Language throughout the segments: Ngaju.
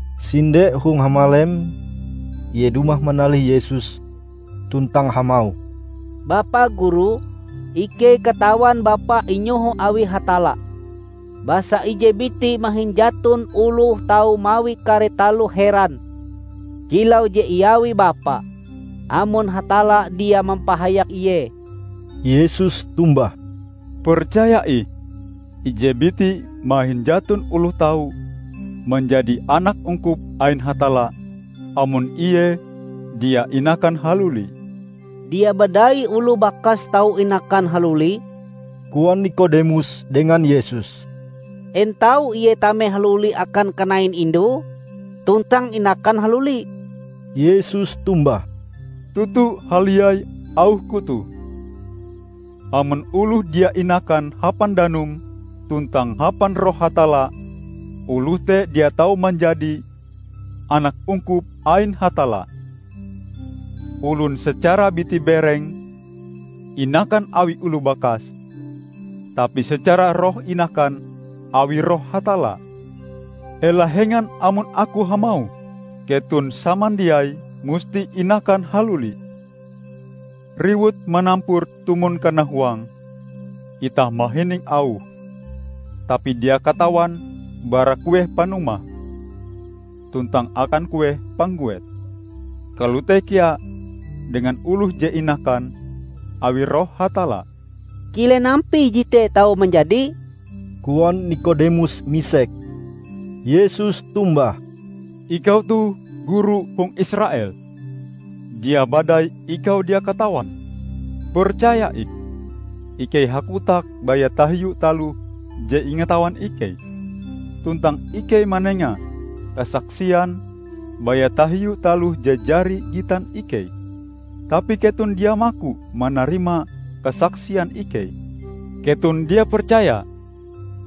Sinde hong hamalem ie dumah manalih Yesus tuntang hamauh, "Bapa Guru, ikei katawan Bapa inyoho awi Hatalla. Basa ije biti mahin jaton oloh tau mawi kare taloh heran kilau je iawi Bapa, amon Hatalla dia mampahayak ie." Yesus tombah, "Percaya ih ije biti mahin jaton oloh tau manjadi anak ungkup ain Hatalla, amon ie dia inakan haluli." "Dia badai oloh bakas tau inakan haluli," koan Nikodemus dengan Yesus, "En tau ie tame haluli akan kanain indue tuntang inakan haluli?" Yesus tombah, "Toto haliai auh-Ku toh: amon oloh dia inakan hapan danum tuntang hapan Roh Hatalla, oloh te dia tau manjadi anak ungkup ain Hatalla. Olon secara biti-bereng inakan awi oloh bakase, tapi secara roh inakan awi Roh Hatalla. Ela hengan amon Aku hamauh, keton samandiai musti inakan haluli. Riwut manampur tumon kanahuange; itah mahining auhe, tapi dia katawan bara kueh panumahe tuntang akan kueh pangguete. Kalote kea dengan oloh je inakan awi Roh Hatalla." "Kilen ampie jete tau manjadi?" koan Nikodemus misek. Yesus tombah, "Ikau toh Guru hong Israel; dia badai ikau dia katawan? Percaya ih: ikei hakotak baya tahiu taloh je ingatawan ikei, tuntang ikei manenga kasaksian baya tahiu taloh je jari gitan ikei; tapi keton dia maku manarima kasaksian ikei. Keton dia percaya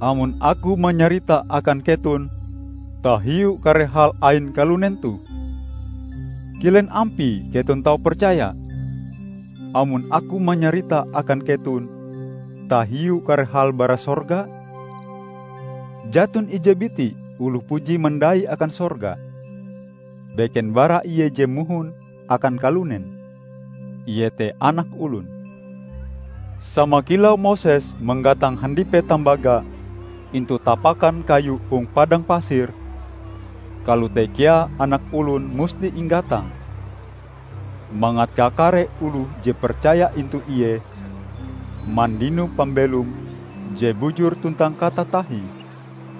amon Aku manyarita akan keton tahiu kare hal ain kalunen toh; kilen ampie keton tau percaya, amon Aku manyarita akan keton tahiu kare hal bara sorga? Jaton ije biti oloh puji mandai akan sorga, beken bara Ie je mohon akan kalunen, ie te Anak Olon. Sama kilau Moses manggatang handipe tambaga intu tapakan kayu hong padang pasir, kalote kea Anak Olon musti inggatang, mangat kakare oloh je percaya intu Ie mandino pambelom je bujur tuntang katatahie."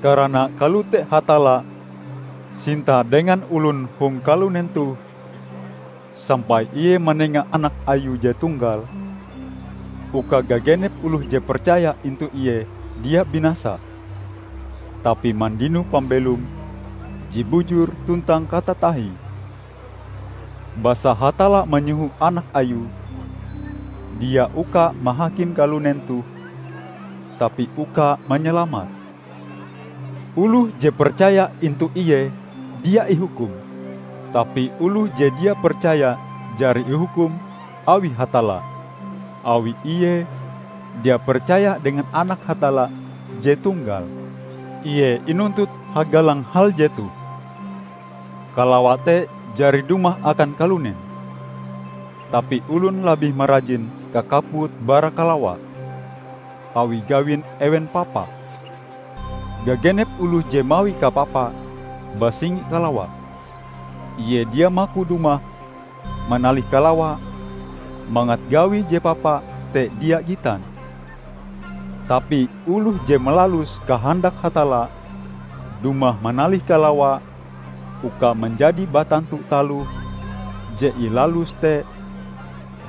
Karana kalote Hatalla sinta dengan olon hong kalunen toh, sampai Ie manenga anak Ayue je tunggal, uka gagenep oloh je percaya intu Ie dia binasa, tapi mandino pambelom je bujur tuntang katatahie. Basa Hatalla manyoho Anak Ayue dia uka mahakim kalunen toh, tapi uka manyalamate. Oloh je percaya intu Ie dia ihukum. Tapi oloh je dia percaya jari ihukum awi Hatalla, awi ie dia percaya dengan Anak Hatalla je tunggal. Ie inuntut hagalang hal jetoh: Kalawa te jari dumah akan kalunen, tapi olon labih marajin kakaput bara kalawa, awi gawin ewen papa. Gagenep oloh je mawi kapapa, basingi kalawa; ie dia maku dumah manalih kalawa, mangat gawie je papa te dia gitan. Tapi oloh je malalus kahandak Hatalla, dumah manalih kalawa uka manjadi batantu taloh je ilaluse te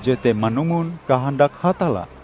jete manumon kahandak Hatalla.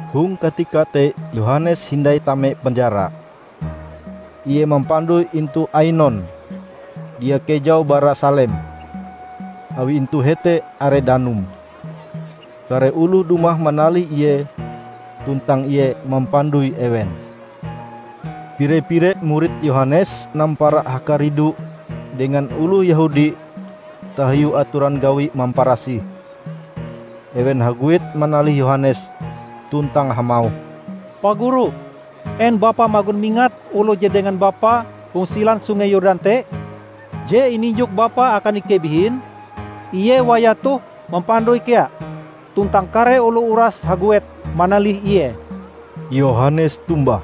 Hong katika te Yohanes hindai tame penjara. Ie mampandoi intu Ainon, dia kejau bara Salem, awi intu hete are danum. Kare oloh dumah manalih ie, tuntang ie mampandoi ewen. Pire-pire murid Yohanes nampara hakaridu dengan oloh Yehudi tahiu atoran gawi mamparasih. Ewen haguet manalih Yohanes, tuntang hamauh, "Pa Guru, en bapa magon mingat oloh je dengan bapa hong silan Sungei Yordan te, je ininjok bapa akan ikei bihin? Ie wayah toh mampandoi kea, tuntang kare oloh uras haguet manalih Ie!" Yohanes tombah,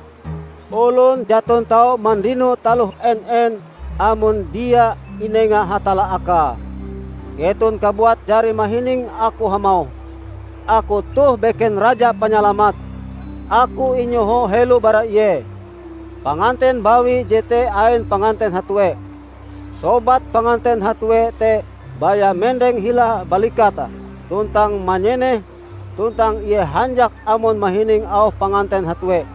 "Olon jaton tau mandino taloh en-en amon dia inenga Hatalla Akae. Keton kabuat jari mahining aku hamauh, 'Aku toh beken Raja Panyalamat. Aku inyoho helo bara Ie.' Panganten bawi jete ain panganten hatue. Sobat panganten hatue te baya mendeng hila balikate tuntang manyeneh, tuntang ie hanjak amon mahining auh panganten hatue.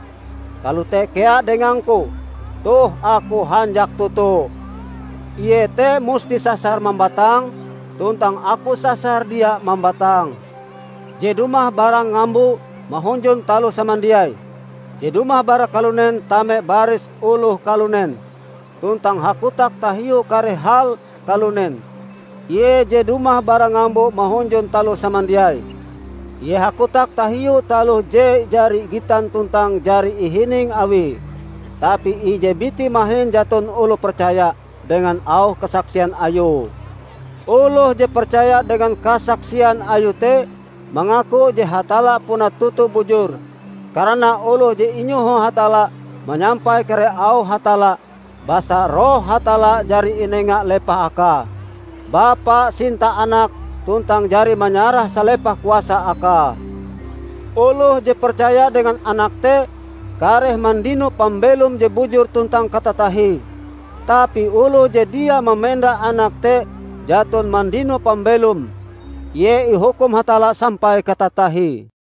Kalote kea dengangku. Toh Aku hanjak toto. Ie te musti sasar mambatang, tuntang aku sasar dia mambatang." Je dumah bara ngambo mahunjun taloh samandiai. Je dumah bara kalunen tame baris oloh kalunen, tuntang hakotak tahiu kare hal kalunen. Ie je dumah bara ngambo mahunjun taloh samandiai. Ie hakotak tahiu taloh je jari gitan tuntang jari ihining Awie, tapi ije biti mahin jaton oloh percaya dengan auh kasaksian Ayue. Oloh je percaya dengan kasaksian Ayue te, mangaku je Hatalla puna toto bujur. Karana oloh je inyoho Hatalla, manyampai kare auh Hatalla, basa Roh Hatalla jari inenga lepah Akae. Bapa sinta Anak tuntang jari manyarah salepah kuasa Akae. Oloh je percaya dengan Anak te, kareh mandino pambelom je bujur tuntang katatahie. Tapi oloh je dia mamenda Anak te jaton mandino pambelom. Ie ihukum Hatalla sampai katatahie.